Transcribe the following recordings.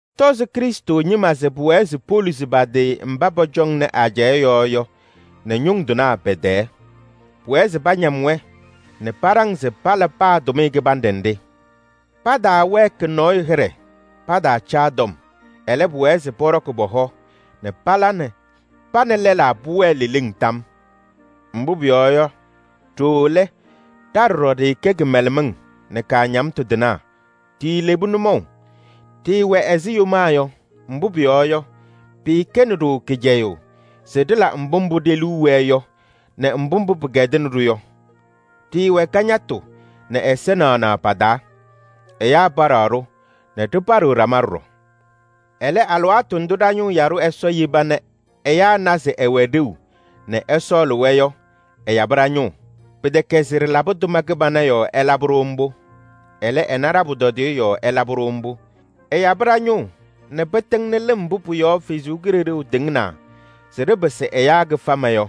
Tɔzɩ Krɩstʋ ñɩma se pʋwɛɛ se poluzi pa-tɩ mba pɔcɔŋnɩ ajɛɛ yɔɔ yɔ nɛ ñʋŋ tɩnaa pɛ-tɛɛ. Pʋwɛɛ se pañam-wɛ nɛ paɖaŋ se pala paa tʋmɩyɛ kɩbanɖɛ nɖɩ. Pataawɛɛkɩ nɔɔyʋ hɩɖɛ, pataacaa tɔm. Ɛlɛ, pʋwɛɛ se pɔɖɔkɩ pɔ-hɔ nɛ pa nɛ lɛlaa pʋwɛɛ leleŋ tam. Mbʋ pʋyɔɔ yɔ, ɖooo lɛ, ɖa ɖɔɖɔ ɖɩɩkɛ kɩmɛlɛmɩŋ nɛ kaañamtʋ tɩnaa, ɖiilebi nʋmɔʋ. Ɖɩɩwɛ ɛzɩ yomaa yɔ, mbʋ pʋyɔɔ yɔ, pɩɩkɛnɩ-ɖʋ kɩcɛyʋʋ se ɖɩla mbʋ mbʋ ɖe-liu wɛɛ yɔ nɛ mbʋ mbʋ pɩkɛdɩnɩ-ɖʋ yɔ. Ɖɩɩwɛ kañatʋ nɛ ɛza naɣnaɣ pa-taa. Ɛyaa paɖaɣ-ɖʋ nɛ ɖɩpaɖɩɣ ɖama ɖɔɖɔ. Ɛlɛ, alɩwaatʋ ndʋ ɖa-ñʋʋ yaɖʋ Ɛsɔ yeba nɛ ɛyaa na se ɛwɛ ɖeu nɛ ɛsɔɔlɩ-wɛ yɔ ɛyabɩ ɖa-ñʋʋ. Pɩtɛkɛ se ɖɩlabɩ tʋma kɩbana yɔɔ ɛlabɩ-ɖʋ mbʋ. Ɛlɛ, ɛna ɖa-pʋtɔdɩyɛ yɔɔ ɛlabɩ-ɖʋ mbʋ. Ɛyabɩ ɖa-ñʋʋ nɛ pɩtɩŋnɩ lɩm mbʋ pʋ-yɔɔ Ɛsɔ Kalɩzaɣ tɩŋnaa se ɖɩpɩsɩ ɛyaa kɩfama yɔ.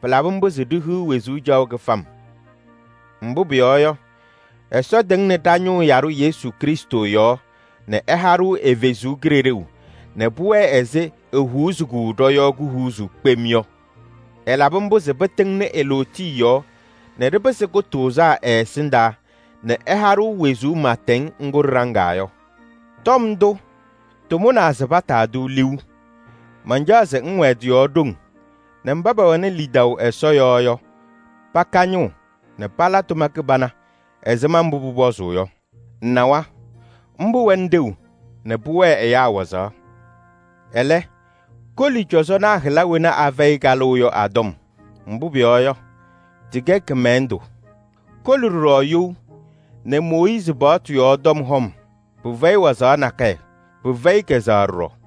Pɩlabɩ mbʋ se ɖihiɣ wezuu caɣʋ kɩfam. Mbʋ pʋyɔɔ yɔ, Ɛsɔ tɩŋnɩ ɖa-ñʋʋ yaɖʋ Yesu Krɩstʋ yɔɔ nɛ ɛha-ɖʋ ɛ-Kalɩzaɣ nɛ pʋwɛɛ ɛzɩ ehuuzi-kɛ ɖɔ-yɔɔ kuhuuzuu kpem yɔ. Ɛlabɩ mbʋ se pɩtɩŋnɩ e-lootiye yɔɔ nɛ ɖɩpɩsɩ kʋtʋʋzaa ɛ-ɛsɩndaa nɛ ɛha-ɖʋ wezuu pɩɩtɛŋ ŋgʋ ɖɩɖaŋaa yɔ. Tɔm ndʋ, tʋmʋnaa se pataa-tʋ liu. Mancaɣ se ŋwɛɛ tɩ-yɔɔ ɖoŋ nɛ mba pɛwɛnɩ lidaʋ Ɛsɔ yɔɔ yɔ, paka ñʋʋ nɛ pala tʋma kɩbana ɛzɩma mbʋ pʋpɔzʋʋ yɔ. Ŋnawa, mbʋ wɛnɩ ɖeu nɛ pʋwɛɛ ɛyaa wazaɣ. Ɛlɛ, koli cɔzɔnaa hɩla wena afɛyɩ kalʋʋ yɔ a-tɔm, mbʋ pʋyɔɔ yɔ, tɩkɛ kɩmɛlɛndʋ. Koli ɖɔɖɔ you nɛ Mooyiizi paɣtʋ yɔɔ tɔm hɔm. Pɩfɛyɩ wazaɣ nakɛyɛ, pɩfɛyɩ kɛzɛɣ ɖɔɖɔ.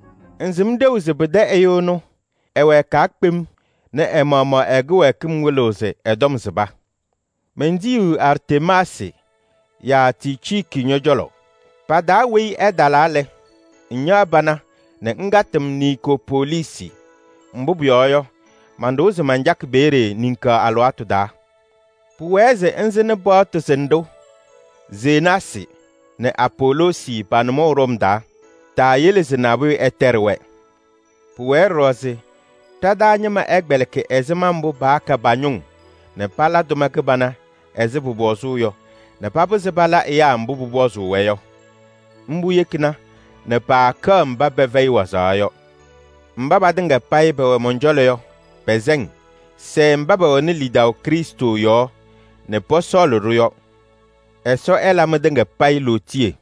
Ŋsɩm ɖeu se pɩtɛ ɛyʋ ɛnʋ ɛwɛɛkaa kpem nɛ ɛ-maɣmaɣ ɛ-kɩwɛɛkɩm wɩlɩɣ se ɛ-tɔm sɩba. Mentiyiɣ Artemaasɩ yaa Ticiiki ñɔ-cɔlɔ. Pa-taa weyi ɛtalaa lɛ, ŋñaɣ pana nɛ ŋkatɩ-m Niikopoliisi. Mbʋ pʋyɔɔ yɔ, manɖʋwa se mancakɩ peeye niŋkaɣ alɩwaatʋ taa. Pʋwɛɛ se ŋsɩnɩ paɣtʋ sɩnɖʋ Zenaasɩ nɛ Apoloosi pa-nʋmɔʋ ɖɔm taa. Taayele se nabʋyʋ ɛtɛɖɩ-wɛ. Pʋwɛɛ ɖɔɖɔ se ɖa-taa ñɩma ɛkpɛlɩkɩ ɛzɩma mbʋ paaka pa-ñʋŋ nɛ pala tʋma kɩbana ɛzɩ pʋpɔzʋʋ yɔ nɛ papɩzɩ pala ɛyaa mbʋ pʋpɔzʋʋ-wɛ yɔ. Mbʋ yekina nɛ paakɛɣ mba pɛfɛyɩ wazaɣ yɔ. Mba patɩŋa payɩ pɛwɛ mɔn-cɔlɔ yɔ, pɛsɛ-ŋ. Sɛɛ mba pɛwɛnɩ lidaʋ Krɩstʋ yɔɔ nɛ pɔsɔɔlɩ-ɖʋ yɔ. Ɛsɔ ɛla mɩtɩŋa payɩ lootiye.